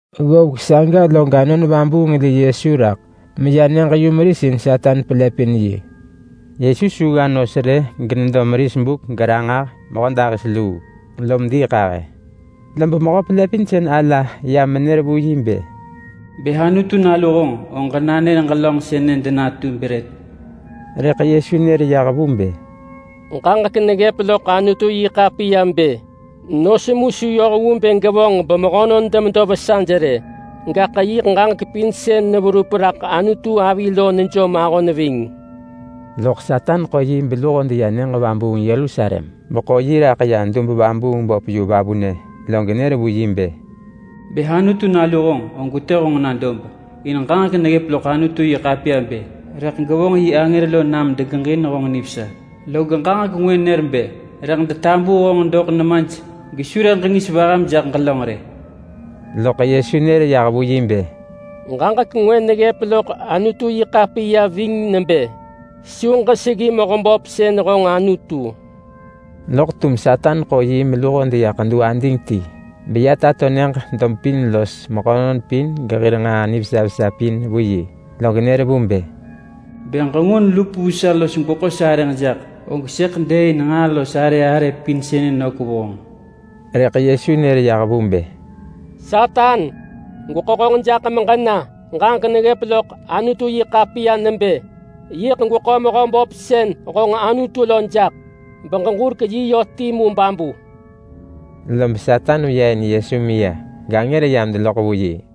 Ggovek saga log Anon Vabuung li Yesu raḳ meya nyëġ-yumeris in Satan pelëpin yi. Yesu su gga nos rë genedo meris buk geranġah mehödahis luu, lom diiḳahë. Lob mehö-pelëpinsën-ala ya menër vu yi bë, “Bë Anutu nalu honġ, og ġenanër ġelönġ sënë denatu brët!” Rëḳ Yesu nër yah vu bë, “Ġaġek neggëp loḳ Anutu-yi-ḳapiya bë: ‘Nos mu su yoh vu bë gevonġ bemehönon demedo vesaj rë, gaḳ yiḳ ġaġek pin sën neverup raḳ Anutu avi lo nejom ahon ving.’” Loḳ Satan ḳo yi beluho deya nyëġ vabuung Yerusalem, beḳo yi raḳ ya dub-vabuung-böp yu vavunë, log nër vu yi bë, “Bë Anutu Nalu honġ, og gwetë honġ na dob, in ġaġek neggëp loḳ Anutu-yi-ḳapiya bë: ‘Rëḳ gevonġ yi angër lo nam degeġin honġ nivesa.’ Log ġaġek ngwë nër bë: ‘Rëḳ detabuu honġ doḳ nemaj gesu rëḳ ġengis vaham jaḳ ġelönġ rë.’” Loḳ Yesu nër yah vu yi bë, “Ġaġek ngwë neggëp loḳ Anutu-yi-ḳapiya ving nebë: ‘Su ġeseggi Mehöböp sën honġ Anutu.’” Loḳ tum Satan ḳo yi meluho deya ḳedu ading ti, beya tato nyëġ dob pin los mehönon pin gehir nġaa nivesa vesa pin vu yi, log nër vu bë, “Bë ġengun lup vu sa los gweḳo sarëġ jaḳ, og sëḳ dëëin nġaa los arë arë pin sënë nök vu honġ!” Rëḳ Yesu nër yah vu bë, “Satan! Gweḳo honġ jaḳ meġena! Ġaġek neggëp loḳ Anutu-yi-ḳapiya nebë: ‘Yiḳ gweḳo Mehöböp sën honġ Anutu lo jaḳ, beġeġurek yi yö timu babu!’” Lob Satan veya in Yesu meya, gangër yam deneloḳ vu yi.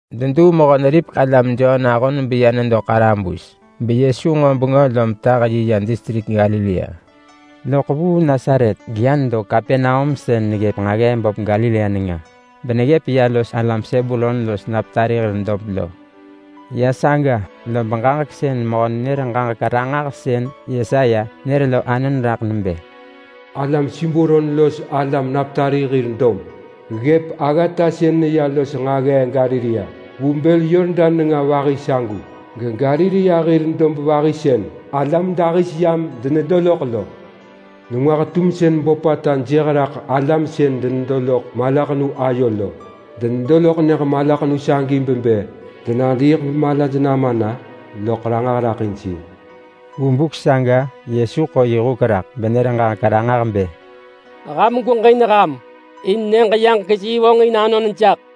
Deduu Mehö-neripek-alam Jon ahon beya nedo ḳarabus, beYesu nġo bengö lom tah yi yah distrik Galilea. Loḳ vuu Nasaret geya nedo Kapernaum sën neggëp nġaggee böp Galilea nenga beneggëp ya los alam Sebulon los Naptali hir dob lo. Ya saga lob ġaġek sën mehö-nenër-ġaġek-ranġahsën Yesaya nër lo anon raḳ nebë: “Alam Sebulon los alam Naptali hir dob, ggëp aggata sën neya los nġaggee Galilea vu bël Yordan nenga vahi sagu. GeGalilea hir dob vahi sën alam dahis yam denedo loḳ lo. Nengwah-tumsën böpata jëh raḳ alam sën denedo loḳ malaḳenu ayo lo! Denedo loḳ nyëġ malaḳenu sagi bebë denadiiḳ bemalaj nama na, loḳ Ranġah raḳ in sir!” Vu buk saga Yesu ḳo yi huk raḳ benër ġaġek ranġah bë, “Ham gweġin ham! In Nyëġ-yaġek-yi vonġin anon jaḳ.”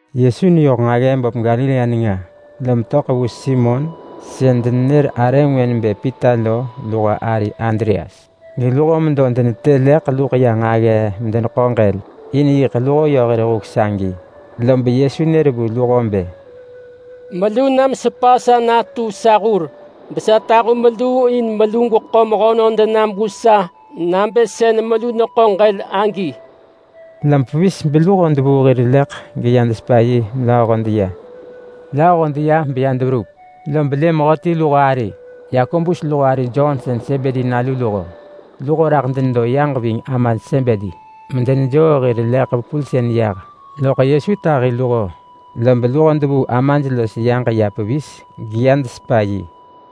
Yesu neyoh nġaggee böp Galilea nenga, lom töḳ vu Simon sën denenër arë ngwë nebë Pita lo luho ari Andreas, geluho medo denetë leḳ luḳ ya nġaggee in bë degeḳo ġël, in yiḳ luho yö hir huk sagi. Lob Yesu nër vu luho bë, “Melu nam sepa sa natu sa hur besa tahu meluu in melu gweḳo mehönon denam vu sa nabë sën melu neḳo ġël agi.” Lob pevis beluho devuu hir leḳ geya desepa yi melööho deya. Lööho deya beya deverup, lob lë mehöti luho ari, Yakobus luho ari Jon sën Sebedi nalu luho. Luho raḳ denedo yaġ ving amaj Sebedi, medenejoo hir leḳ vepulsën yah. Loḳ Yesu tahi luho, lob luho devuu amaj los yaġ ya pevis geya desepa yi.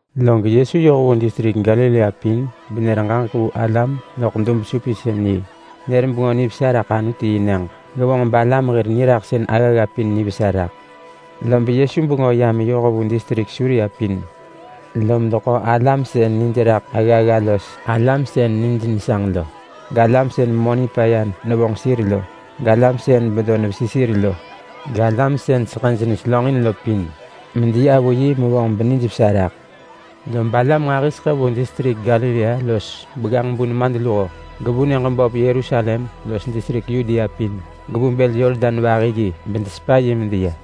Log Yesu yoh vu distrik Galilea pin benër ġaġek vu alam loḳ dub-supinsën-yi. Nër Bengö Nivesa raḳ Anutu-yi-nyëġ, gevonġ balam hir niraḳsën aggagga pin nivesa raḳ. Lob Yesu bengö ya meyoh vu distrik Suria pin, lom deḳo alam sën nij raḳ aggagga los alam sën nij nesanġ lo, galam sën memö nipaya nevonġ sir lo, galam sën bedo nevesi sir lo, galam sën seḳëj neselönġin lo pin, medeya vu yi mevonġ benijvesa neraḳ. Lob alam nġahiseḳë vu distrik Galilea los Begganġ-bu-nemadluho gevu nyëġ böp Yerusalem los distrik Yudea pin, gevu bël Yordan vahi yi, bedesepa yi medeya.